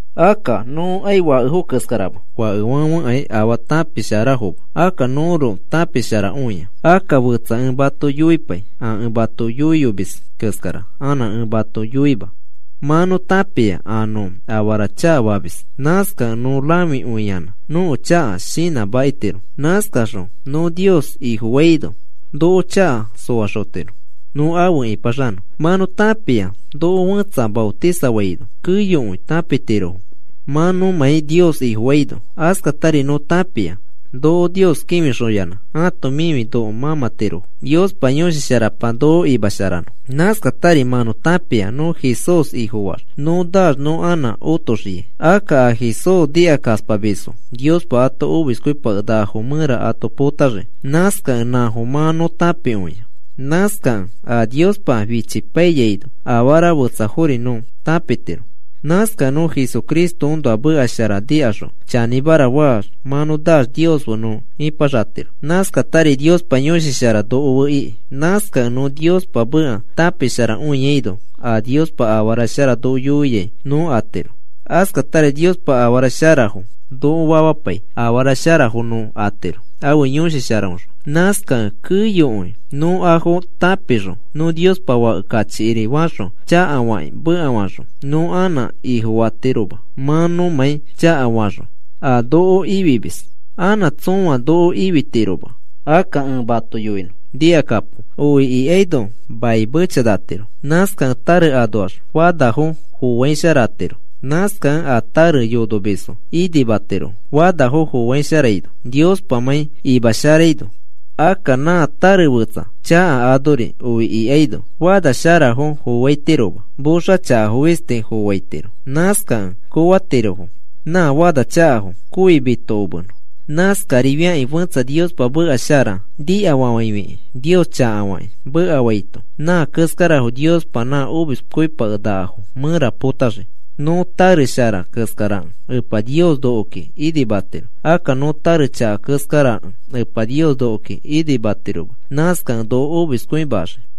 Akka nõkai fakefo keskarama. Fakefãfekai afaa tãpisharafoma. Akka nõroko tãpisharakõia. Akka fetsa ẽ mato yoipai a ẽ mato yoiyomis keskara anã ẽ mato yoima. Mã nõ tãpia a nõ afara chakafamis. Nãskakẽ nõ rãfikõiyanã nõko chaka shinãmakitiro. Nãskaxõ nõ Nios Ifofaino noko chaka soaxotiro nõ afe ĩpaxanõ. Mã nõ tãpia noko fẽtsa maotisafaino keyokõi tãpitirofo mã nõmãi Nios Ifofaino. Askatari nõ tãpia noko Nios kĩfixoyanã ãto mifi noko mãmãtirofo Niospa Yõshi Sharapa noko imasharanõ. Nãskatari mã nõ tãpia nõ Jesús Ifofaax nõ naax nõ anã otoxiai. Akka a Jesús nikakaspamisfo Niospa a omiskõipakenakafo mẽra ato potaxii. Nãskakẽ nãfo mã nõ tãpikõia. Nãskakẽ a Niospa fichipaiyaino afara fetsafori nõ tãpitiro. Nãskakẽ nõ Jesucristoõnoa meka shara nikaxõ chanĩmara faax mã naax Nios fe nõ ipaxatiro. Nãskatari Niospa Yõshi Shara noko fe iki. Nãskakẽ nõ Niospa meka tãpisharakõiaino a Niospa afara shara noko yoiai nõ atiro. Askatari Niospa afara sharafo noko famapai afara sharafo nõ atiro, ãfe Yõshi Sharaõxõ. Nãskakẽ keyokõi nõ afo tãpifixõ nõ Niospa Fake kachikiri faxõ chakafakĩ mekafaxõ, nõ anã Ifofatiroma mã nõmãi chakafaxõ a noko Ifimis. Anã tsõa noko ifitiroma. Akka ẽ mato yoinõ nikakapo. Oi ikaino mai mechanatiro. Nãskakẽ tare anoax fanafo foaisharatiro. Nãskakẽ a tare yonomisfo inimatirofo fanafo foaisharaino Niospamãi imasharaino. Akka nã tare fetsa chaka anori oi ikaino, fanasharafo foaitiroma. Moxa chakafo fisti foaitiro. Nãskakẽ koofatirofo nã fanachakafo kooi mitokomenõ. Nãskarifiakĩ fẽtsa Niospa meka shara nikafafãifikĩ Nios chakafakĩ mekafaito nã keskarafo Niospa nã omiskõipakenakafo mẽra potaxii. Nõ tare shara keskarakẽ Epa Nios nokoki inimatiro. Akka nõ tare chaka keskarakẽ Epa Nios nokoki inimatiroma. Nãskakẽ noko omiskõimaxii.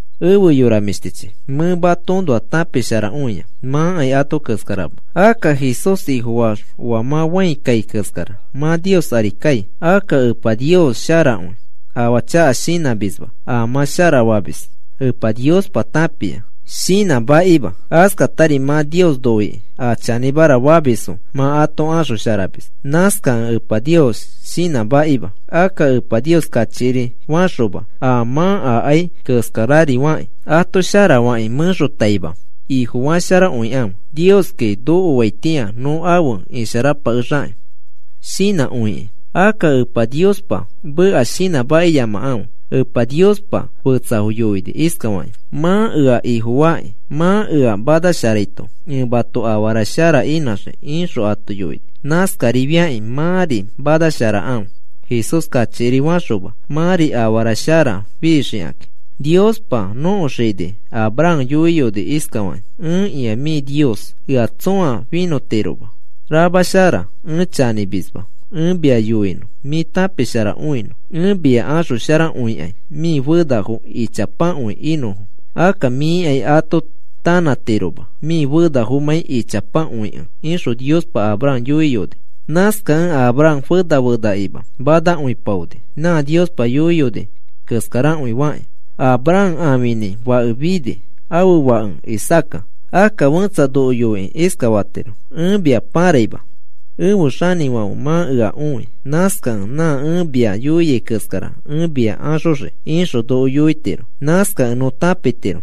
Efe yora mĩshtichi, mẽ matoõnoa tãpisharakõia. Mãkai ato keskarama. Akka Jesús Ifofaax oa mã fãi kai keskara mã Nios ari kai. Akka Epa Nios sharakõi. Afaa chaka shinãmisma. A mã sharafamis Epa Niospa tãpia, shinãmakima. Askatari mã Nios noikĩ a chanĩmara famisfo mã ato axosharamis. Nãskakẽ Epa Nios shinãmakima. Akka Epa Nios kachikiri faxoma a mã akai keskararifakĩ, ato sharafakĩ mẽxotaima Ifofasharakõikãfe, “Nioski nokoaitĩa nõ afe isharapakexakĩ,” shinãkõikĩ. Akka Epa Niospa meka shinãmakiyamakãfe. Epa Niospa fetsafo yoini iskafakĩ: “Mã ea Ifofakĩ mã ea manasharaito ẽ mato afara shara inãxii,” ixõ ato yoini. Nãskarifiakĩ mãri manasharakãfe, Jesús kachikiri faxoma. Mãri afara shara fixikakĩ. Niospa nõko xini Abraham yoiyoni iskafaki: “Ẽkĩa mĩ Nios. Ea tsõa finõtiroma. Ramashara ẽ chanĩmisma. Ẽ mia yoinõ mĩ tãpisharakõinõ. Ẽ mia axosharakõikai mĩ fenafo ichapakõi inõfo. Akka mĩkai ato tanãtiroma mĩ fenafomãi ichapakõikẽ,” ixõ Niospa Abraham yoiyoni. Nãskakẽ Abraham fena fenakima manakõipaoni. Nã Niospa yoiyoni keskarakõi fakĩ Abraham ãfinĩ fake fini. Ãfe fake Isaaca. Akka fẽtsa noko yoikĩ iskafatiro: “Ẽ mia pãraima ẽfe xanĩfãfe mã ea õi. Nãskakẽ nã ẽ mia yoiai keskara ẽ mia axoxii,” ixõ noko yoitiro. Nãskakẽ nõ tãpitiro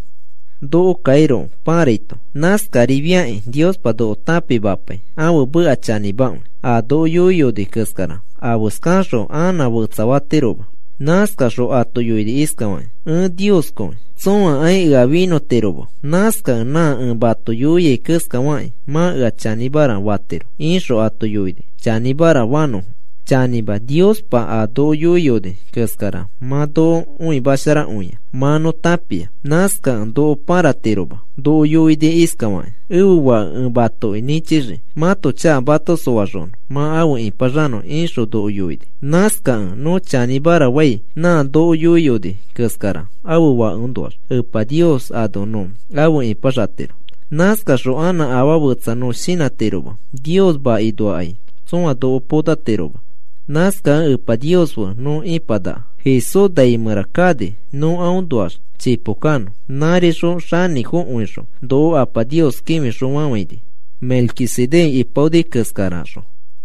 nokokairoko pãraito. Nãskarifiakĩ Niospa noko tãpimapai ãfe meka chanĩmakõi. A noko yoiyoni keskara afeskaxõ anã fetsafatiroma. Nãskaxõ ato yoini iskafakĩ: “Ẽ Nioskõi. Tsõakai ea finõtiroma. Nãskakẽ nã ẽ mato yoiai keskafakĩ mã ea chanĩmara fatiro,” ixõ ato yoini chanĩmara fanõfo. Chanĩma Niospa a noko yoiyoni keskara mã noko õimasharakõia mã nõ tãpia. Nãskakẽ noko pãratiroma. Noko yoini iskafakĩ: “Ẽfe Fake ẽ matoki nĩchixii mãto chaka mato soaxonõ mã efe ĩpaxanõ,” ixõ noko yoini. Nãskakẽ nõ chanĩmara fai nã noko yoiyoni keskara ãfe Fakeõnoax Epa Nios ano nõ afe ipaxatiro. Nãskaxõ anã afaa fetsa nõ shinãtiroma. Nios makinoakai tsõa noko potatiroma. Nãskakẽ Epa Nios fe nõ ipanaka. Jesús nai mẽra kani nõ aõnoax chipo kanõ. Nãrixõ xanĩfokõixõ noko Apa Nios kĩfixõfafãini Melquisedec ipaoni keskaraxõ.